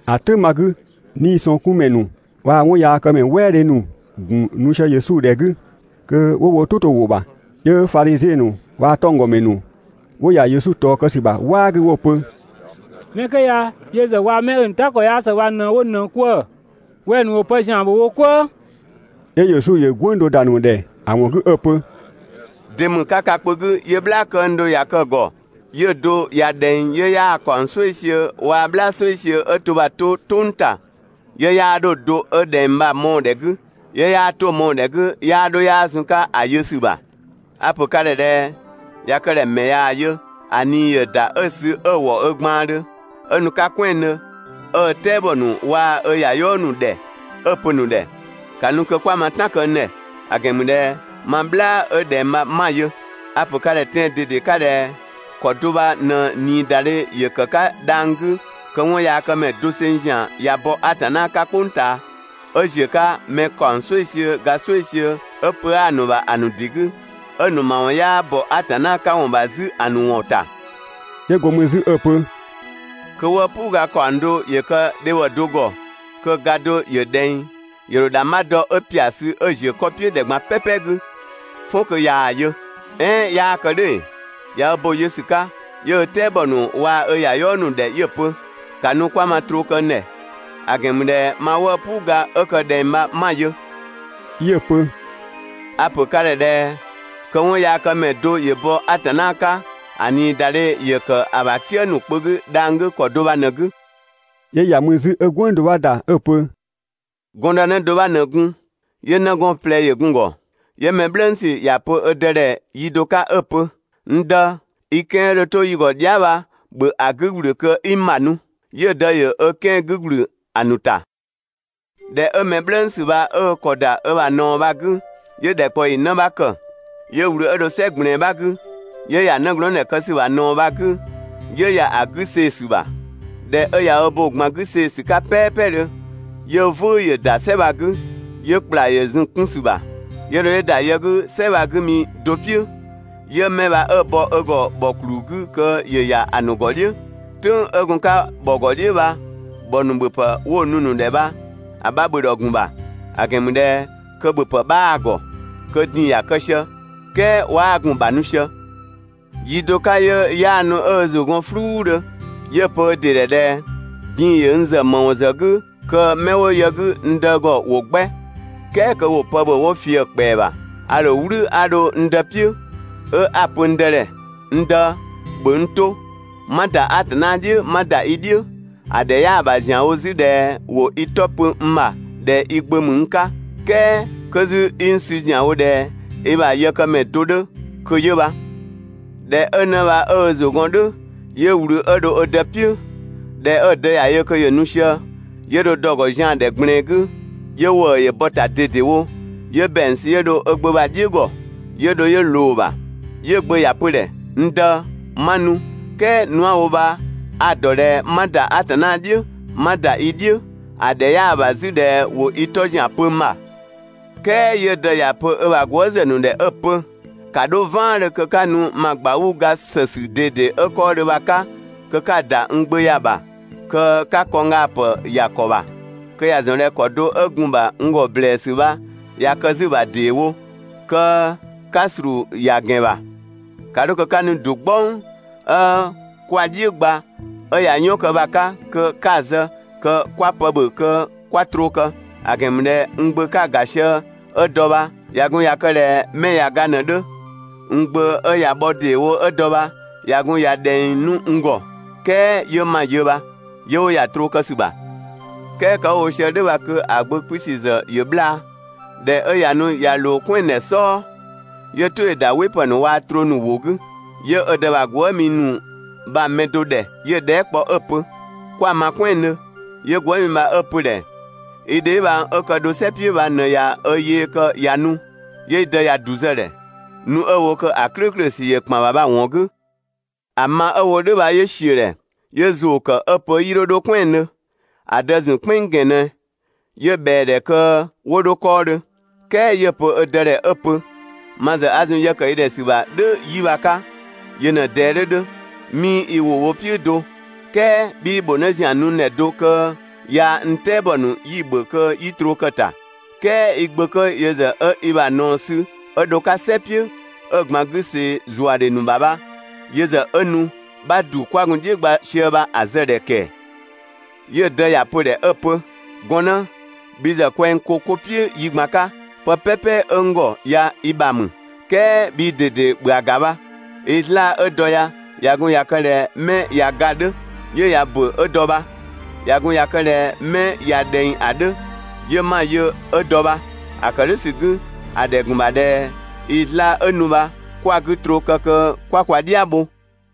‑A "tʋ̈ng bha‑ 'gü, 'niisɔngkunmɛ ‑nu waa‑ 'wɔnyaakëmɛ "wɛɛdhe ‑nu ‑gun nu sië Yesu ‑dhɛ 'gü kö 'wo "tʋ 'to‑ ‑wʋ ‑bha. 'Yö Fadhiziɛn ‑nu waa‑ 'tɔnggɔmɛ ‑nu 'wo ‑ya Yesu ꞊tɔɔ kë ‑sü ‑bha "waa 'gü 'wo‑ pö: «Mɛ 'kö ya yö ‑zë waa‑ 'mɛ 'ö‑ ‑nu "ta ‑kɔ 'yaa ‑së bha ꞊në 'wo ꞊nëng 'kwëë‑. Wɛng‑ ‑nu ‑wo pë ‑zian ‑bhö wo "kwëë.» 'Yö Yesu ‑yö "gwënng do ‑da ‑nu ‑dhɛ ‑a ‑wɔn 'gü 'ö‑ pö: «De ‑mü ka kpö 'gü 'yö "bhlaa këng do ꞊ya kë‑ ‑gɔ, 'yö‑ do ꞊ya ꞊dhɛng 'yö 'yaa‑ ‑kaɔng "sueisiö waa‑ "bhlaa "sueisiö 'ö to bha‑ 'to "tʋng ‑ta, 'yö 'yaa 'dho‑ do ö ꞊dhɛng bha‑ mɔɔ‑ ‑dhɛ 'gü, 'yö 'yaa 'to‑ mɔɔ‑ ‑dhɛ 'gü 'yaa 'dho 'yaa zun‑ 'ka ‑a yö ‑sü ‑bha? A‑ ‑pö ka ‑dhɛ ꞊dhɛ: ꞊Ya kë ꞊dhɛ‑ ‑mɛ ꞊yaa‑ yö, ‑a ꞊nii ‑yö ‑da 'ö‑ sü 'ö‑ ‑wɔ ö gbaandhö, 'ö nu‑ 'ka "kwɛandhö 'ö ö "tɛabɔ ‑nu waa‑ ö ‑yayɔɔ ‑nu ‑dhɛ 'ö‑ pö‑ ‑nu ‑dhɛ: «‑Ka nu kö 'kwa ma "tan kë n ‑dhɛ, ‑a ‑gɛn ‑mü ꞊dhɛ ma "bhlaa 'ö ꞊dhɛng bha 'ma‑ yö!» A‑ ‑pö ka ‑dhɛ tɛan‑ ꞊dede 'ka ꞊dhɛ: ‑Kɔ do bha ꞊në ꞊niidadhe ‑yö kë‑ 'ka dhang‑ 'gü kö 'wɔnyaakëmɛ doseng ‑zian ꞊ya bɔ Atanna 'ka "kpʋng ꞊taa 'ö ‑ziö 'ka mɛ ‑kaɔng "sueisiö ga "sueisiö 'ö pö 'aa‑ ‑nu ‑bha ‑a ‑nu ‑dɩ 'gü, 'ö‑ ‑nu ‑mawɔn 'yaa ‑bɔ Atanna 'ka ‑wɔn ‑bha 'zü ‑a ‑nu ‑wɔn ‑ta.» 'Yö go mü 'zü 'ö‑ pö: «Kö 'wëë‑ "puu ga ‑kaɔng do ‑yö kë dhebhɔ do ‑gɔ, kö‑ ga do ‑yö ꞊dhɛng, ‑yö ‑dho ‑dhangbha dɔ 'ö ‑pia sü 'ö‑ ‑ziö 'kɔ "piʋ̈ ‑dhɛ ꞊gban "pɛpɛ 'gü, "fɔn kö ꞊yaa‑ yö. "Ɛɛn 'yaa kë "dhʋ̈ ‑ee? ꞊Ya ö bo‑ yö ‑sü 'ka, 'yö ö "tɛabɔ ‑nu waa‑ ö ‑yayɔɔ ‑nu ‑dhɛ 'yö‑ pö: «‑Ka nu 'kwa ma troo kë n ‑dhɛ, ‑a ‑gɛn ‑mü ꞊dhɛ ma 'wëë‑ "puu ga 'a kë‑ ꞊dhɛng bha 'ma‑ yö!» 'Yö‑ pö: «A‑ ‑pö ka ‑dhɛ ꞊dhɛ: Kö 'wɔnyaakëmɛ do ‑yö bɔ Atanna 'ka, ‑a ꞊niidadhe ‑yö ‑kë ‑a ‑bha "kië ‑nu kpö 'gü dhang‑ 'gü ‑kɔ do bha ꞊në‑ 'gü.» 'Yö ‑ya mü 'zü 'ö "gwënng do 'bha ‑da 'ö‑ pö: «Gɔndënë do 'bha ꞊në gun, 'yö 'nëgɔɔn ꞊plɛ ‑yö gun‑ ‑gɔ. 'Yö‑ mɛ "bhlëngsü ‑ya pö ö dë ‑dhɛ yi do 'ka 'ö‑ pö: «N dë, i 'kɛan‑ 'ö dho 'to yi ‑gɔ dhia" bha, ‑bhö ‑a 'gü ‑gblü kö 'i n ‑bha nu.» 'Yö‑ dë ‑yö ö 'kɛan‑ 'gü ‑gblü ‑a ‑nu ‑ta. ꞊Dhɛ 'ö mɛ "bhlëngsü bha 'ö ö ‑kɔ ‑da ö ‑bha ꞊naɔ bha‑ 'gü, 'yö ‑dhɛkpaɔyi 'në 'bha ‑kë, 'yö ꞊wlü 'ö dho "sɛ ꞊gblɛɛn 'bha 'gü, 'yö ‑ya 'nëglɔɔndhɛ kë ‑sü ‑bha ꞊naɔ bha‑ 'gü, 'yö ‑ya ‑a 'gü see‑ ‑sü ‑bha. ꞊Dhɛ 'ö ꞊ya ö bo‑ ꞊gban 'gü see‑ ‑sü 'ka "pɛɛpɛdhö, 'yö "vʋ̈ʋ̈ ‑yö ‑da "sɛ bha‑ 'gü, 'yö ‑kpla ‑yö zun‑ 'kun ‑sü ‑bha. 'Yö dho 'yö ‑da yë 'gü "sɛ bha‑ 'gü mi do "piʋ̈, 'yö 'mɛ bha 'ö‑ bɔ ö ‑gɔ ‑bhɔ ‑kluu 'gü kö ‑yö ‑ya ‑a ‑nu ‑gɔ "dhiʋ̈. "Tʋ̈ng 'ö gun‑ 'ka ‑bhɔ ‑gɔ "dhiʋ̈ bha, ‑bhɔ ‑nu ‑bhöpë 'wo‑ nu‑ ‑nu ‑dhɛ bha‑ 'bha ‑bhö ‑dhɔ ‑gun ‑bha; ‑a ‑gɛn ‑mü ꞊dhɛ kö ‑bhöpë 'bhaa‑ ‑gɔ, (kö din‑ ‑ya kë sië), "kɛɛ 'waa gun‑ ‑bha nu sië. Yi do 'ka 'yö 'yaanu 'ö ö ‑zʋ gɔn "fluudhö 'yö‑ pö: «Din‑ ‑yö n ‑zë ‑më ‑wɔn ‑zë 'gü kö 'mɛ 'wo yë 'gü n dë ‑gɔ ‑wo 'gbɛ, "kɛɛ kö ‑wo pë ‑bhö 'wo ꞊fië‑ ‑kpɛa ‑bha. A ‑dho "wlü 'a dho n dë "piʋ̈, 'ö 'a‑ pö n dë ‑dhɛ: «N dë, ‑bhö n 'to, 'ma ‑da Atanna "dhiʋ̈, 'ma ‑da i "dhiʋ̈, ‑a ‑dhɛ 'yaa ‑bha ‑zianwo 'zü ꞊dhɛ ‑wo i 'tɔ pö n ‑bha ꞊dhɛ i gbö ‑mü n 'ka, "kɛɛ 'kö 'zü 'i n 'sü ‑zianwo ꞊dhɛ i ‑bha yëkëmɛ do 'dhö kö 'yö bha.» ꞊Dhɛ 'ö 'në bha 'ö ö ‑zʋ gɔn "dhʋ̈, 'yö ꞊wlü 'ö dho ö dë "piʋ̈. ꞊Dhɛ 'ö‑ dë ‑ya yö kö ‑yö nu sië, 'yö dho dɔ‑ ‑gɔ zian‑ ‑dhɛ ꞊gblɛɛn 'gü, 'yö ‑wëë ‑yö bɔ‑ ‑ta ꞊dedewo, 'yö ‑bɛang sü 'ö dho ö gbö bha‑ "dhiʋ̈ ‑gɔ 'yö dho 'yö ꞊loo‑ ‑bha. 'Yö‑ gbö ‑ya pö‑ ‑dhɛ: «N dë, 'ma nu, "kɛɛ nu 'a‑ wo bha a‑ ‑dɔ ꞊dhɛ 'ma ‑da Atanna "dhiʋ̈, 'ma ‑da i "dhiʋ̈, ‑a ‑dhɛ 'yaa ‑bha 'zü ꞊dhɛ ‑wo i 'tɔ ‑zian pö n ‑bha.» "Kɛɛ 'yö‑ dë ‑ya pö ö ‑bha gwëëzë ‑nu ‑dhɛ 'ö‑ pö: «‑Ka 'dho "vaandhö kö 'ka nu ma ꞊gbauu‑ ga ‑sësü ꞊dede 'ö 'kɔɔdhö bha‑ 'ka kö 'ka‑ ‑da n gbö ya‑ ‑bha, kö 'ka kɔnggaapë ‑ya ‑kɔ ‑bha (kö ‑ya ‑zɔn ꞊dhɛ ‑kɔ do 'ö gun‑ ‑bha n ‑gɔ ‑blɛɛsü bha ꞊ya kë 'zü‑ ‑bha ‑deewo), kö 'ka ‑slu ‑ya ‑gɛn ‑bha! ‑Ka 'dho kö 'ka nu ‑du "gbɔng 'ö 'kwa‑ "dhiʋ̈ gba 'ö ꞊ya "yɔn kë bha‑ 'ka kö 'ka‑ zë kö 'kwa pë ‑bhö kö 'kwa troo kë! ‑A ‑gɛn ‑mü ꞊dhɛ n gbö 'ka‑ ‑ga sië 'ö dɔ bha, ꞊ya gun ꞊ya kë ꞊dhɛ 'mɛ ꞊ya ga ꞊në‑ 'dhö, n gbö 'ö ꞊ya bhɔ ‑deewo ö dɔ bha ꞊ya gun ꞊ya ꞊dhɛng 'nu n ‑gɔ, "kɛɛ 'yö 'ma‑ yö bha!» 'Yö 'wo ‑ya troo kë ‑sü ‑bha. "Kɛɛ kë 'wo‑ wo sië "dhʋ̈ bha kö ‑a gbö 'kpiisü ‑zë ‑yö 'bhlaa. ꞊Dhɛ 'ö ꞊ya nu ꞊ya ꞊loo "kwɛandhɛ "sɔɔ, 'yö‑ "tʋ ‑yö ‑da "wɩpë ‑nu waa‑ troo ‑nu ‑wʋ 'gü. 'Yö ö dë ‑bha gwëë" ‑nu bha‑ mɛ do ‑dhɛ 'yö‑ dhɛɛ" kpɔ 'ö‑ pö: «'Kwa‑ ma "kwɛandhö?» 'Yö gwëëmi bha 'ö‑ pö‑ ‑dhɛ: «I dheebhang 'ö kë dho "sɛ "piʋ̈ bha ꞊në ꞊ya ö yee kë ꞊ya nu, 'yö i dë ꞊ya ‑du zë‑ ‑dhɛ, nu 'ö‑ wo kö ‑a "klʋ̈ʋ̈klʋ̈ ‑sü ‑yö ‑kpan ‑bha bha‑ ‑wɔn 'gü.» ‑A ma 'ö‑ wo "dhʋ̈ bha 'yö ‑siö ‑dhɛ, 'yö ‑zʋʋ ‑kë 'ö‑ pö 'yii 'dho 'dho "kwɛandhö. ‑A dë‑ ‑zun "kpɛnng ‑gɛn ꞊nɛ, 'yö ꞊bhɛa‑ ‑dhɛ kö 'wo 'dho 'kɔɔdhö. "Kɛɛ 'yö‑ pö ö dë ‑dhɛ 'ö‑ pö: «Ma ‑zë 'a zun yë ‑kë i ‑dhɛ ‑sü ‑bha "dhʋ̈ 'yi bha‑ 'ka, yö ꞊në‑ ꞊dɛɛ 'dhö 'dhö, 'mii i ‑wʋ bho‑ "piʋ̈ do, "kɛɛ 'bhii ‑bhʋ 'në ‑zian nu n ‑dhɛ do kö yaa‑ n "tɛabɔ ‑nu 'yi‑ ‑bhö kö 'yi troo kë‑ ‑ta, "Kɛɛ i gbö 'kö yö ‑zë 'ö i ‑bha ꞊naɔ sü 'ö dho‑ 'ka "sɛ "piʋ̈, 'ö‑ ꞊gban 'gü see‑ ‑zuadhe ‑nu ‑bha bha, yö ‑zë 'ö nu 'bha ‑du 'kwa gun‑ "dhiʋ̈ gba sië bha‑ zë‑ ‑dhɛ ‑kɛɛ!» 'Yö‑ dë ‑ya pö‑ ‑dhɛ 'ö‑ pö: «Gɔnnë, bhi ‑zë kwɛng ko 'ko "piʋ̈ yi ꞊gban 'ka, pë "pɛpɛ 'ö n ‑gɔ ya i ‑bha ‑mü, "kɛɛ bhii ꞊dede ‑bhö ‑a ‑ga bha, i 'zlaa‑ 'ö dɔ ya, ꞊ya gun ꞊ya kë ꞊dhɛ 'mɛ ꞊ya ga‑ 'dhö, 'yö ꞊ya ‑bö 'ö dɔ bha, ꞊ya gun ꞊ya kë ꞊dhɛ 'mɛ ꞊ya ꞊dhɛng ‑a 'dhö, 'yö 'ma‑ yö ö dɔ bha. (‑A ‑kë "dhʋ̈ ‑sü 'gü, ‑a ‑dhɛ ‑gun ‑bha ꞊dhɛ i 'zlaa‑ 'ö nu bha, 'kwa‑ 'gü ‑troo kë kö 'kwa kwa "dhia bho).»